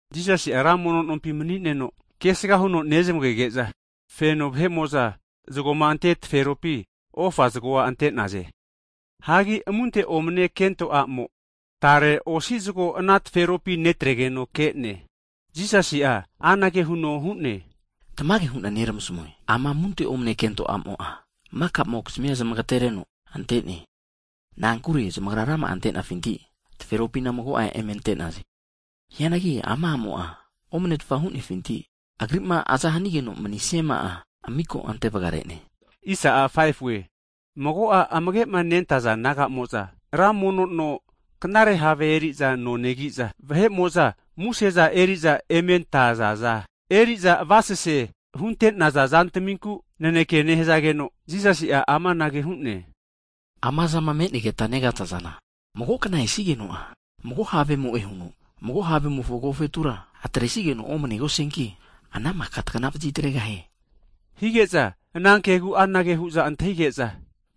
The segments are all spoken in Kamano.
Jisasi ranmono nompi mani'neno kesga huno nezmagege'za, feno vahe'mo'za zgoma ante taferopi ofa zgoa ante'naze. Hagi amunte omne kento a'mo tare osi zgo ana taferopi netregeno ke'ne. Jisasi'a anage huno hu'ne, Tamage hu'na neramasamue, ama amunte omne kento amo'a makamokizmia zamagtereno ante'ne. Na'ankure zamagra rama'a antenafinti, taferopina mago'a eme ante'naze. Hianagi ama amo'a omnetfa hunefinti, agri'ma aza hanigeno manisiama'a miko ante vgarene. Mago'a amagema nentaza disaipol nagamo'za ra mono no knare have eri'za no negiza, vahe'mo'za museza eri'za ementazaza, eriza avasese hunte'naza zantaminku naneke nehzageno, Jisasi'a amanage hu'ne. Amazama me'negeta negazazana, magokna esigeno'a mago havemo'e huno, mago havemofo agofetura atresageno omnegosianki, ana maka tagna vazitregahie. Hige'za, ana kegu anage hu'za antahige'za,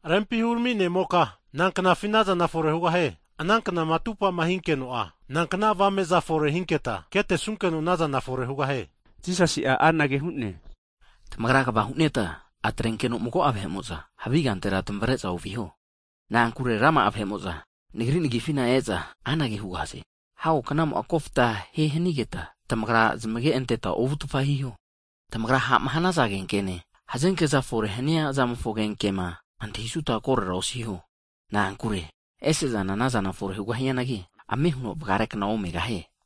rempi hurami ne'moka, nanknafi anazana fore hugahie? Ana knama atupama hinkeno'a nankna avame'za fore hinketa ketesunkeno anazana fore hugahie? Jisasi'a anage hu'ne, tamagra kva huneta atrenkeno mago'a vahe'mo'za havi kantera tamavreza oviho. Na'ankure rama'a vahe'mo'za Nagri nagifina eza anage hugahaze, nagra ana neki, hago knamo'a koftahie hanigeta, tamagra zamage anteta ovutfa hiho. Tamagra ha'ma hanaza agenkene, hazenkeza fore'ma haniazamofo agenkema antahisuta korera osiho, na'ankure ese'zana anazana fore hugahianagi, ame huno vgarekna omegahie.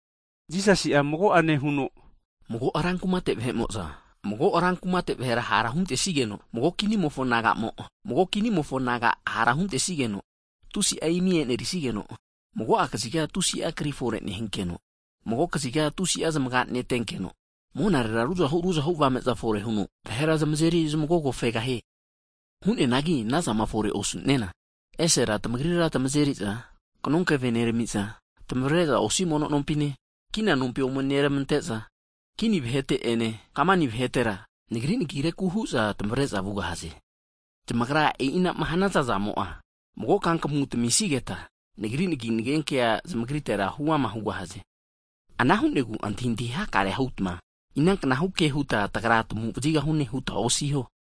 Jisasi mago'ane huno, mago rankumate vahe'mo'za, mago rankumate vahera hara huntesigeno, mago kinimofo naga'mo, mago kinimofo naga hara hunentesigeno, tusi'a imi enerisigeno, mago'a kaziga tusi'a kri fore nehinkeno, mago'a kaziga tusi'a zamaga netenkeno, monarera ruzahu ruzahu avameza fore huno vahera zmazeri zmagogofegahie. Hu'neanagi anazana fore osu'nena, esera tamagrira tmazeri'za kanonkeve neramami'za, tamavre'za osi mono nompine, kina nompi ome neramante'za, kini vahete'ene kamani vahetera, Nagri nagireku hu'za tamavre'za vugahaze. Zamagrama e'inama hanaza zamo'a, mago kankamu tamamisigeta, Nagri nagi nagenkea huama zamagritera hugahaze. Ana hu'negu antahiantahi hakare hutma, inaknahu ke huta tagra'a tagu vazigahune hutma osiho.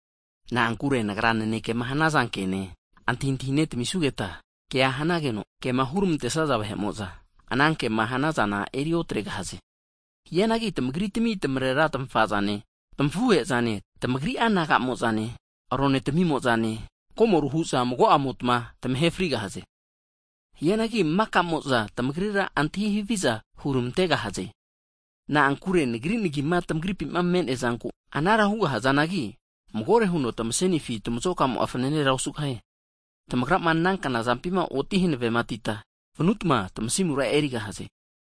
Na'ankure Nagra nanekema hanaza kene antahintahine tamisugeta, kea hanageno, kema huramantesaza vahe'mo'za, ana kema hanazana eri otregahaze. Hianagi tamagritami tamarera tamafazane, tamafuhezane, tamagri'a nagamo'zane, ronetamimozane, komoru hu'za mago'amota tamahe frigahaze. Hagi maka'mo'za, tamagrira antahi haviza huramantegahaze. Na'ankure Nagri nagima tamagripi me'neazanteku anara hugahazanagi, magore huno tamasenifi tamazokamo'a fanane osugahie. Tamagrama ana knazampima oti hanavetita vanutma tamasimura erigahaze.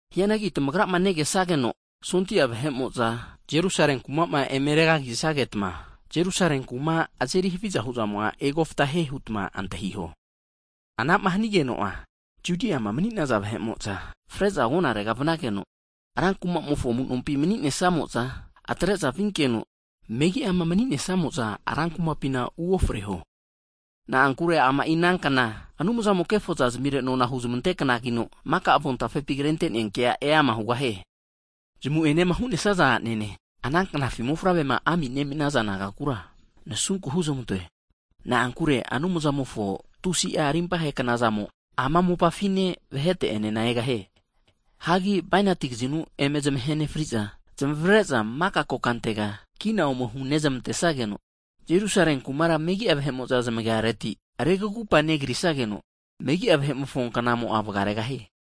Hianagi tamagrama negesageno sondia vahe'mo'za Jerusale kumama eme regagisagetma, Jerusale kuma azeri haviza hu'zamo'a egofta hie hutma antahiho. Anama hanigeno'a Judiama mni'naza vahe'mo'za freza agonarega vnageno, rankumamofo amunompi mni'nesamo'za atre'za vinkeno, megiama mani'nesamo'za rankumapina uofreho. Na'ankure ama'i ana kna, Anumzamo kefozazmire nona'a huzmante knagino, maka avontafepi krentenea kea eama hugahie. Zmu'enema hu'nesaza anene, ana knafi mofavrema ami nemiza nagamofonkura nasunku huzmantoe. Na'ankure Anumzamofo tusi'a rimpahe knazamo, ama mopafine vahete'enena egahie. Hagi bainati kazinu eme zmahe nefriza, zmavre'za maka kokantega kina ome hunezmantesageno, Jerusale kumara megi'a vahe'mo'za zmagiareti regugupa negrisageno, megi'a vahe'mofo knamo'a vgaregahie.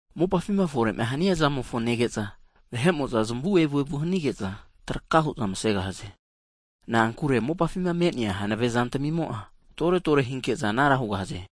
Mopafima fore'ma hanizamofo nege'za vahe'mo'za zamu evuevu hanige'za traka hu'za masegahaze. Na'ankure monafima me'nea hanave zantamimo'a toretore hinke'za anara hugahaze.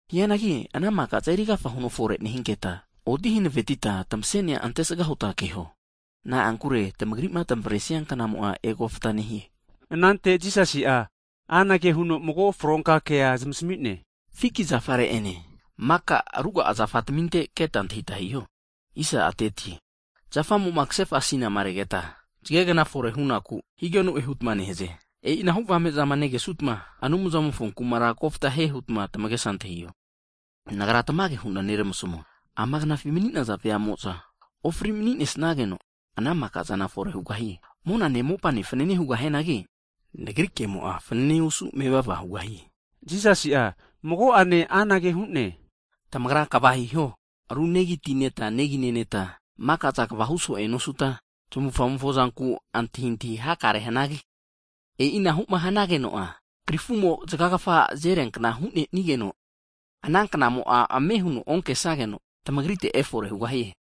Hianagi ana maka'za erigafa huno fore nehinketa, oti hanavetita tamasenia antesga hutma keho. Na'ankure tamagri'ma tamavresia knamo'a egofta nehie. Anante Jisasi'a anage huno mago fronka kea zamasmi'ne, fiki zafare'ene maka ruga'a zafataminte keta antahita hiho. Zafamo'ma kasefa asinama regeta, zagegna fore hunaku higeno'e hutma nehaze. E'inahu avame'zama negesutma, Anumzamofo kumara kofta hie hutma tamagesa antahiho. Nagra tamage hu'na neramasmue, ama knafi mani'naza veamo'za ofri mani'nesnageno, ana maka'zana fore hugahie. Monane mopane fanane hugahianagi, Nagri kemo'a fanane osu mevava hugahie. Jisasi'a mago'ane anage hu'ne, tamagra kva hiho. Ru negi ti neta negineneta, makazana kva huso'e nosuta, tmavufamofo zanku antahintahi hakare hanagi, e'inahuma hanageno'a krifumo zgagafa azeriankna hu'nenigeno, ana knamo'a ame huno onkesageno tmagritera efore hugahie.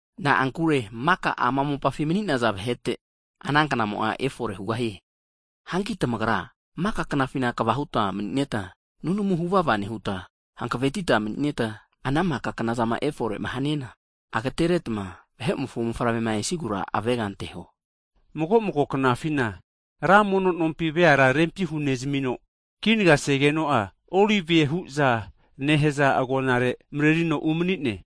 Na'ankure maka ama mopafi mni'naza vahete ana knamo'a efore hugahie. Hanki tamagra maka knafina kva hutma maninetma, nunamuna huvava nehutma, hankavetita mni'neta ana maka knazama efore'ma haniana agateneretma, Vahe'mofo Mofavrema esigura avega anteho. Mago mago knafina ra mono nompi veara rempi hunezmino, kinagasegeno'a Olivie huza nehaza agonare mrerino umanine.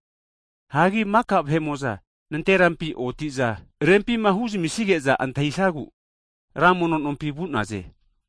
Hagi maka vahe'mo'za nanterampi otiza rempima huzamisige'za antahisagu ra mono nompi vu'naze.